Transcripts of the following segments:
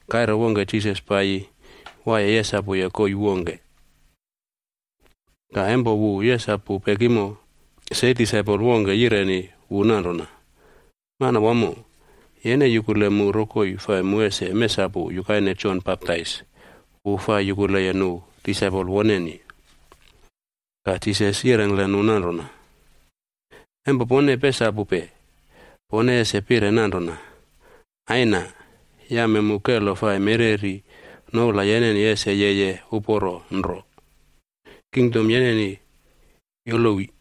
Kaire wongke Jisas paiyi waiye yesapuye koii wongke, ka empo wu yesapu pekimo, se disaipol wongke yireni wu nanrona, “Manawamo, yene yukule mu rokoi fai mu ese mesapu yukaine Jon Baptais wu fai yukuleye nu disaipol woneni.” Ka Jisas yirengkle nu nanrona, “Empo pone pesapupe, pone ese pire nanrona: ‘Aina, yame mu kelo fai mereri noula yeneni ese yeye holi. Kingdom yeneni yolowi.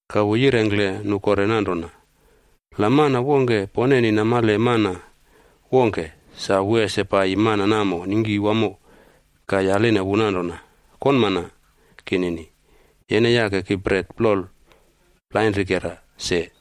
Ka wu yirengkle nu kore nanrona, “La mana wongke poneni namale mana wongke, sa wu ese paiyi mana namo ningki wamo ka yaline wu nanrona, ‘Konmana kinini, yene yake ki bret plol plainrikera se.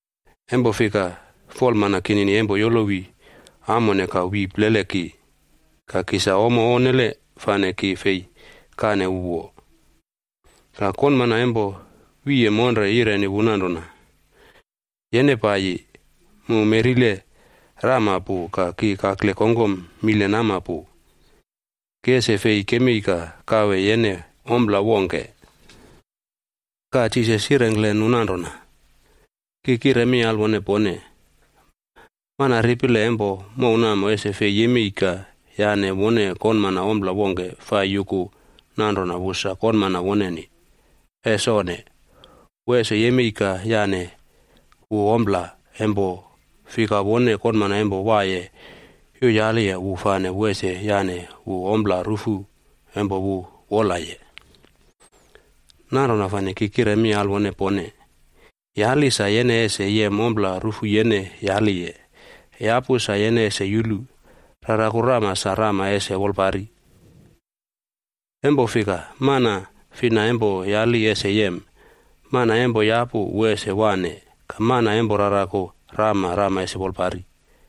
Empo fika, folmana kinini empo yolowi amone ka wi plele ki, ka ki sa ommo onnele fane ki fei kane wu wo.’ “Ka konmana empo wiye monre namo yireni wu nanrona, ‘Yene paiyi, mu meꞌrile rama pu ka ki kakle kongkom mile nama pu. Ki ese fei kemei ka kawe yene ompla wongke.’” Ka Jisas yirengkle nu nanrona, “Ki kire mi alwone pone, mana ripile empo mow namo ese fei yemei ka yane wone konmana ompla wongke fai yuku nanrona wu sa konmana woneni. Es onne! Wu ese yemei ka yane wu ompla, empo fika wone konmana empo waiye yuyaliye wu fane wu ese yane wu ompla rufu empo wu wolaye. “Nanrona fane ki kire mi alwone pone, yali sa yene ese yem ompla rufu yene yaliye; yapu sa yene ese yulu; raraku rama sa rama ese wolpari. Empo fika mana fina empo yali ese yem; mana empo yapu wu ese waꞌne; ka mana empo raraku rama, rama ese wolpari.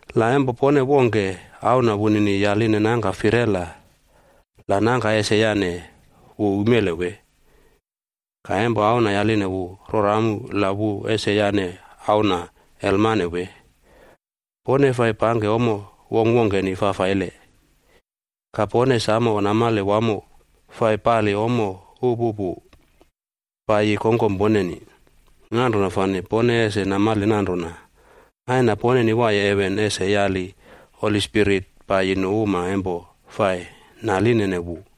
“La empo pone wongke, auna wunini yaline nangka firela, la nangka ese yane wu umele wee? Ka empo auna yaline wu rora amu, la wu ese yane auna elmane wee? Pone fai pangke ommo wongkwongkeni fafaile, ka pone samo namale wamo fai pali ommo upupu paiyi kongkom poneni. Nanrona fane pone ese namale nanrona Aina poneni waiye heven ese yali Holi Spirit paiyi nu uma empo fai nalinene wu!”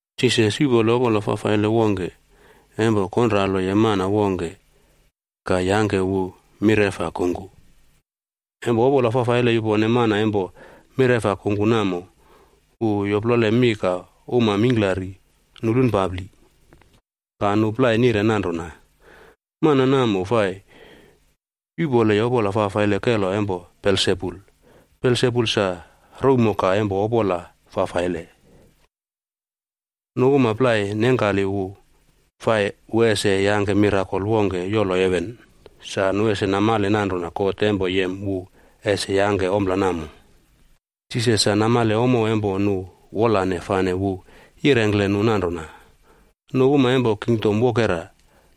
Jisas yuꞌpole opola fafaile wongke empo konraloye mana wongke ka yangke wu mireꞌfa kungku. Empo opola fafaile yupone mana empo mireꞌfa kungku namo, wu yoplole mi ka uma mingklari nulunpapli. Ka nu plai nire nanrona, “Mana namo fai yuꞌpoleye opola fafaile kelo empo Belsebul. Belsebul sa rouwmoka empo opola fafaile.” Nu uma plai nengkali nire naline Jisas fai wu ese yangke mirakol wongke yolo heven sa nu ese namale nanrona God empo yem wu ese yangke ompla namo. Jisas sa namale ommo empo nu wolane fane wu yirengkle nu nanrona, “Nu uma empo kingdom wokera,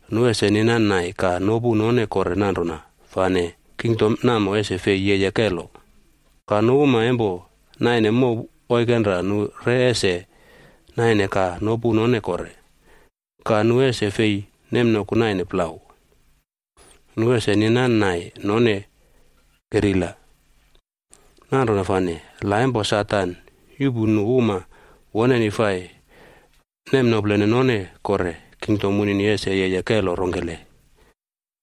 nu ese ninan nai ka nopu none kore nanrona fane kingdom namo ese fei yeye kelo. Ka nu uma empo naine mow oikenra nu re ese naine ka nopu none kore, ka nu ese fei nemnoku naine plau, nu ese ninan nai none kerila. Nanrona fane, la empo Satan yuꞌpu nu uma woneni fai nemnoplene none kore, kingdom wunini ese yeye kelo rongkele?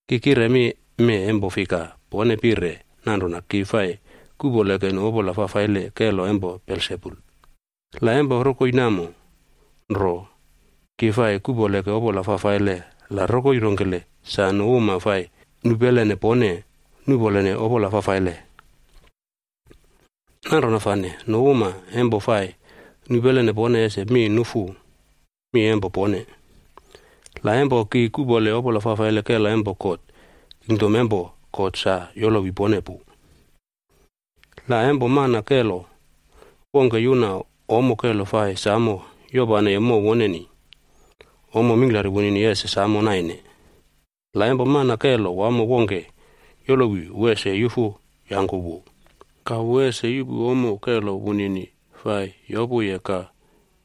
Ki kire mi mee empo fika pone pire nanrona ki fai kuꞌpoleke nu opola fafaile kelo empo Belsebul. La empo rokoi namo nro, ki fai kuꞌpoleke opola fafaile la rokoi rongkele sa nu uma fai nupelene pone nuꞌpolene opola fafaile? Nanrona fane, nu uma empo fai nupelene pone ese mi nufu mi empo pone. La, empo ki kuꞌpole opola fafaile kelo empo God, kingdom empo God sa yolowi pone pu. “La empo mana kelo wongke yuna ommo kelo fai samo yopaneye mow woneni, ommo mingklari wunini ese samo naine. La empo mana kelo wamo wongke yolowi, wu ese yufu yangku wu, ka wu ese yuꞌpu ommo kelo wunini fai yopuye ka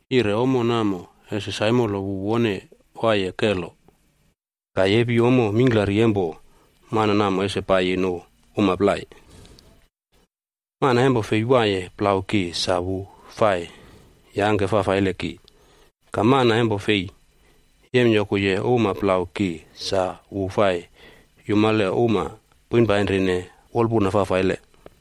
yire ommo namo ese saimolo wu wone waiye kelo, ka yepi ommo mingklari empo mana namo ese paiyi nu uma plai. “Mana empo fei waiye plau ki sa wu fai yangke fafaile ki. Ka mana empo fei yemyokuye uma plau ki sa wu fai yumale uma poinpainrine wolpuna fafaile.”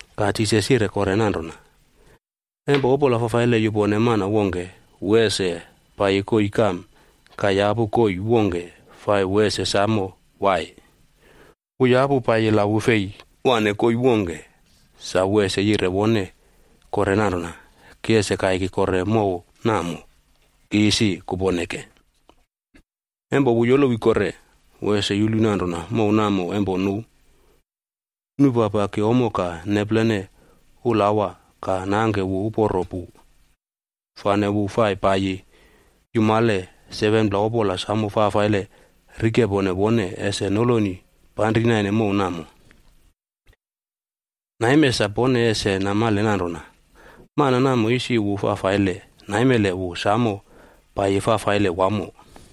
Ka Jisas yire kore nanrona, “Empo opola fafaile yupone mana wongke, wu ese paiyi koii kam ka yapu koii wongke fai wu ese samo wai. Wu yapu paiyi la wu fei waꞌne koii wongke sa wu ese yire wone kore nanrona, ‘Ki ese kaiki kore mow namo ki isi kuponeke.’ Empo wu yolowi kore, wu ese yulu nanrona mow namo empo nu nupapaki ommo ka neplene ulawa ka nangke wu uporo pu. Fane wu fai paiyi yumale 7pla opola fafaile samo fafaile rikepone wone ese noloni panri naine mow namo. Naime sa pone ese namale nanrona mana namo isi wu fafaile, naimele wu samo paiyi fafaile wamo.”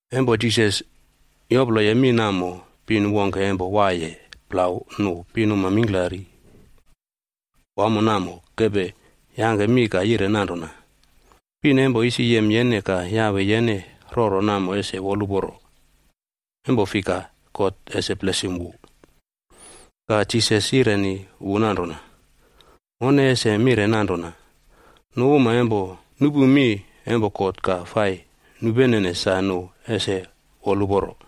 Empo Jisas yoploye mi namo, pin wongke empo waiye plau nu pinuma mingklari wamo namo kepe yangke mi ka yire nanrona, “Pin empo isi yem yene ka yawe yene roro namo ese woluporo, empo fika God ese blesim wu.” Ka Jisas yireni wu nanrona, “Mone ese mire nanrona, nu uma empo nupu mi empo God ka fai nupenene sa nu ese woluporo.”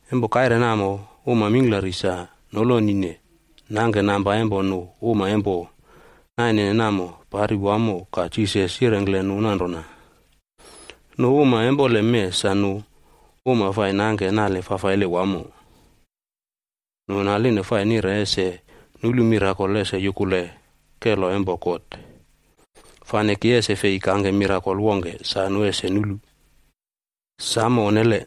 Empo kaire namo uma mingklari sa nolonine nangke namba empo nu uma empo nainene namo pari wamo ka Jisas yirengkle nu nanrona, “Nu uma empoleme sa nu uma fai nangke nale fafaile wamo. Nu naline fai nire ese nulu mirakol ese yukule kelo empo God. Fane ki ese fei kangke mirakol wongke sa nu ese nulu. Samo onnele!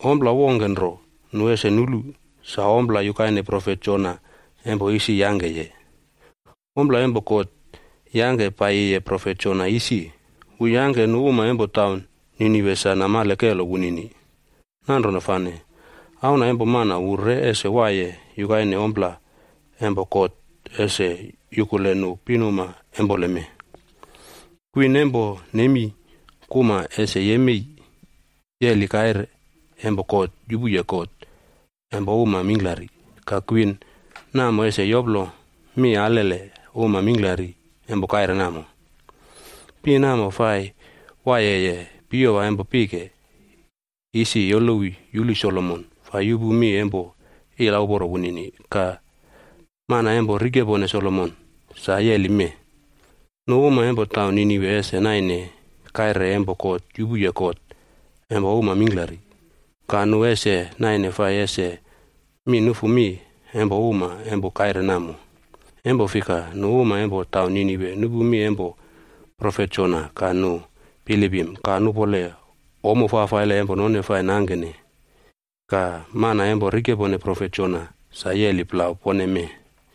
Ompla wongke nro nu ese nulu, sa ompla yukaine profet Jonaa empo isi yangkeye. Ompla empo God yangke paiyiye profet Jona isi, wu yangke nu uma empo taun Ninive sa namale kelo wunini. Nanrona fane, Auna empo Mana wu re ese waiye yukaine ompla empo God ese yukule nu pinuma empoleme. Kwin empo Nemi kuma ese yemei yeli kaire empo God yupuye kot empo uma mingklari, ka kwin namo ese yoplo mi alele uma mingklari empo kaire namo. Pin namo fai waiyeye piyowa empo pike isi yolowi yupu Solomon fai yupu mi empo ilauporo wunini. Ka mana empo rikepone Solomon sa yeli mee. Nu uma empo taun Ninive ese naine kaire empo God yupuye kot empo uma mingklari, ka nu ese naine fai ese mi nufu mi empo uma empo kaire namo. Empo fika nu uma empo taun Ninive nupu mi empo profet Jona ka nu bilipim ka nupole ommo fafaile empo none fai nangkene. Ka mana empo rikepone profet Jona sa waiye plau pone mee.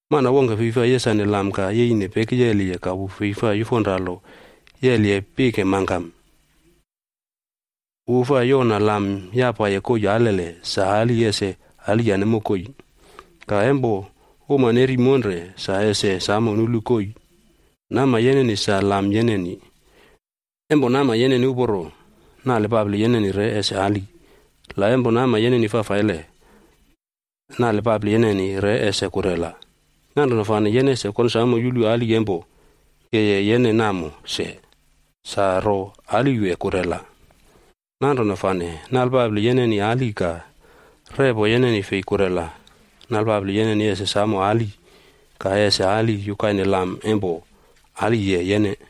“Mana wongke fei fai yesane lam ka yeine pekiyeliye ka wu fei fai yufonralo yeliye pike mangkam. Wu fai yona lam yapaye koii alele sa ali ese aliyane mokoi. Ka empo uma neri monre sa ese samo nulu koii. Nama yeneni sa lam yeneni. Empo nama yeneni uporo, nale papli yeneni re ese ali. La empo nama yeneni fafaile, nale papli yeneni re ese kurela. Nanrona fane yene ese konsamo yulu ali empo yeye yene namo se, sa ro ali wee kurela? Nanrona fane, nalpapli yeneni ali ka repo yeneni fei kurela, nalpapli yeneni ese samo ali ka ese ali yukaine lam empo aliye yene.”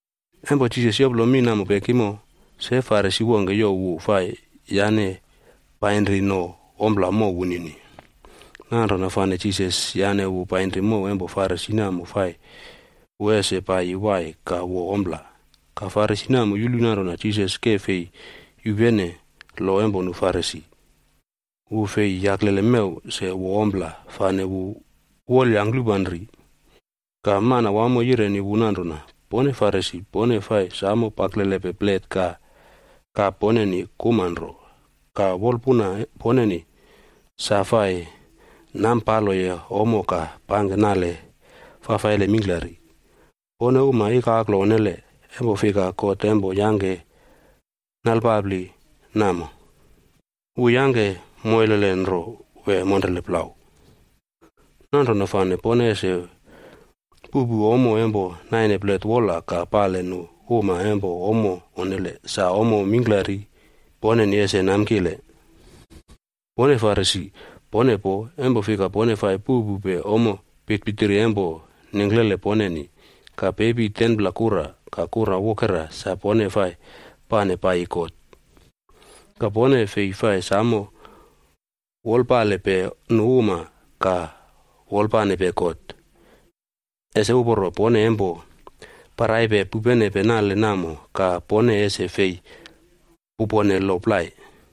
Empo Jisas yoplo mi namo pekimo, se Farisi wongke yaline wu fai yane painri no ompla mow wunini. Nanrona fane Jisas yane wu painri mow empo Farisi namo fai wu ese paiyi wai ka wo ompla. Ka Farisi namo yulu nanrona Jisas ke fei yupene lo empo nu Farisi, wu fei yaklele mew se wo ompla, fane wu wolyangklupanri. Ka Manawamo yireni wu nanrona, “Pone Farisi pone fai samo paklelepe plet ka kap poneni kuma nro, ka wolpuna poneni sa fai nampaloye ommo ka pangke nale fafaile mingklari. Pone uma ikaklo onnele! Empo fika God empo yangke nalepapli namo, wu yangke moilele nro wee monrele plau? Nanrona fane pone ese puꞌpu ommo empo naine plet wola ka pale nu uma empo ommo onnele sa ommo mingklari poneni ese namkile. “Pone Farisi, pone poo, empo fika pone fai puꞌpupe ommo pitpitiri empo nengklele poneni, ka pepi 10pla kura ka kura wokera sa pone fai pane paiyi God. Ka pone fei fai samo wolpalepe nu uma ka wolpanepe God. Ese uporo pone empo paraipe pupenepe nale namo ka pone ese fei pupone lo plai.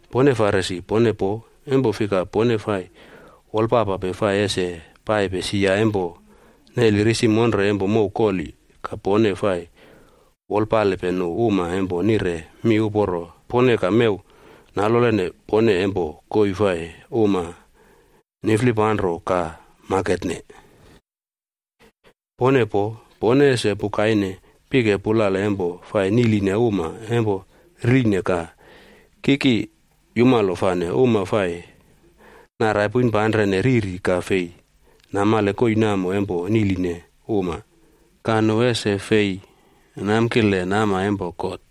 “Pone Farisi, pone poo, empo fika pone fai wolpapape fai ese paipe sia empo neli risi monre empo mow koli ka pone fai wolpalepe nu uma empo nire mi uporo pone ka mew nalolene pone empo koii fai uma niflipanro ka maketne. “Pone poo, pone ese pukaine pike pulale empo fai niꞌline uma empo riline ka kiki yumalo fane uma fai narai poinpanrene riri ka fei namale koii namo empo niꞌline uma. Ka nu ese fei namkile nama empo God.”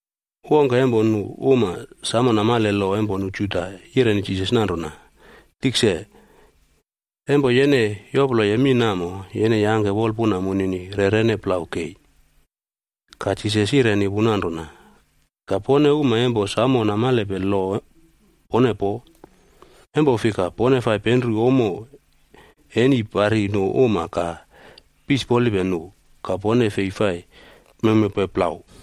Wongke empo nu uma samo namale lo empo nu Juda yireni Jisas nanrona, “Tikse, empo yene yoploye mi namo, yene yangke wolpuna munini rerene plau kei.” Ka Jisas yireni wu nanrona, “Ka pone uma empo samo namalepe lo pone poo, empo fika pone fai penru ommo eni pari nu uma ka pisipolipe nu. Ka pone fei fai mewmewpe plau.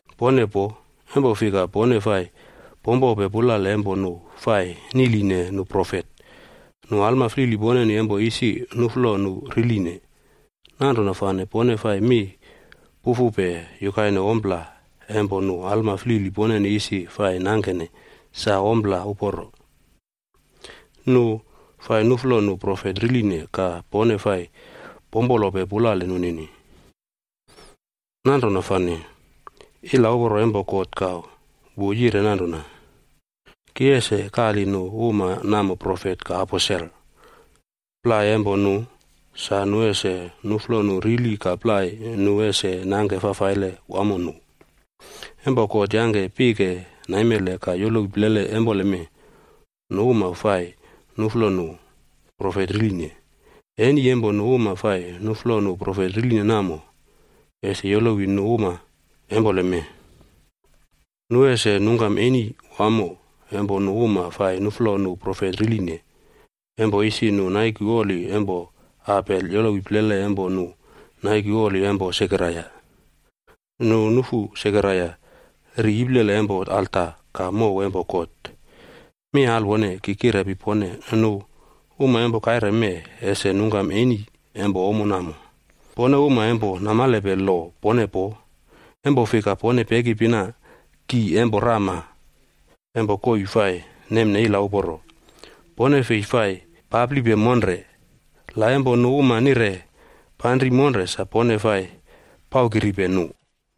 “Pone poo, empo fika pone fai pompope pulale empo nu fai niꞌline nu profet. Nu alma flili poneni empo isi nuꞌflo nu riline. Nanrona fane pone fai mi pufupe yukaine ompla empo nu alma flili poneni isi fai nangkene sa ompla uporo. Nu fai nuꞌflo nu profet riline ka pone fai pompolope pulale nunini. Nanrona fane ilauporo empo God ka wu yire nanrona, ‘Ki ese kali nu uma namo profet ka aposel. Plai empo nu, sa nu ese nuꞌflo nu rili ka plai nu ese nangke fafaile wamo nu.’ Empo God yangke pike naimele ka yolowi plele empoleme, nu uma fai nuꞌflo nu profet riline. Eni empo nu uma fai nuꞌflo nu profet riline namo, ese yolowi nu uma empoleme. Nu ese nungkam eni wamo empo nu uma fai nuꞌflo nu profet riline, empo isi nu naiku oli empo Abel yolowi plele empo nu naiku oli empo Sekaraia.b Nu nufu Sekaraia ri iplele empo alta ka mow empo God. Mi alwone, ki kirepi pone, nu uma empo kaire mee ese nungkam eni empo ommo namo. “Pone uma empo namalepe lo pone poo, empo fika pone pekipina ki empo rama empo koii fai nemne ila uporo. Pone fei fai paplipe monre, la empo nu uma nire panri monre sa pone fai paukiripe nu.”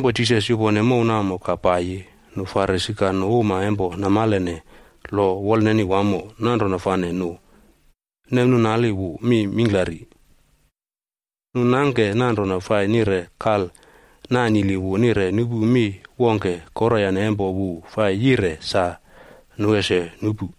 Jisas yoplo mi pekimo ka yupone mow namo. Ka empo kaire namo ka paiyi nu Farisi ka nu uma empo namalene lo wolneni wamo, nanrona fane nu nemnuꞌnali wu mi mingklari. Nu nangke nanrona fai nire kal nanili wu nire nupu mi wongke koroyane empo wu fai yire sa nu ese nupu.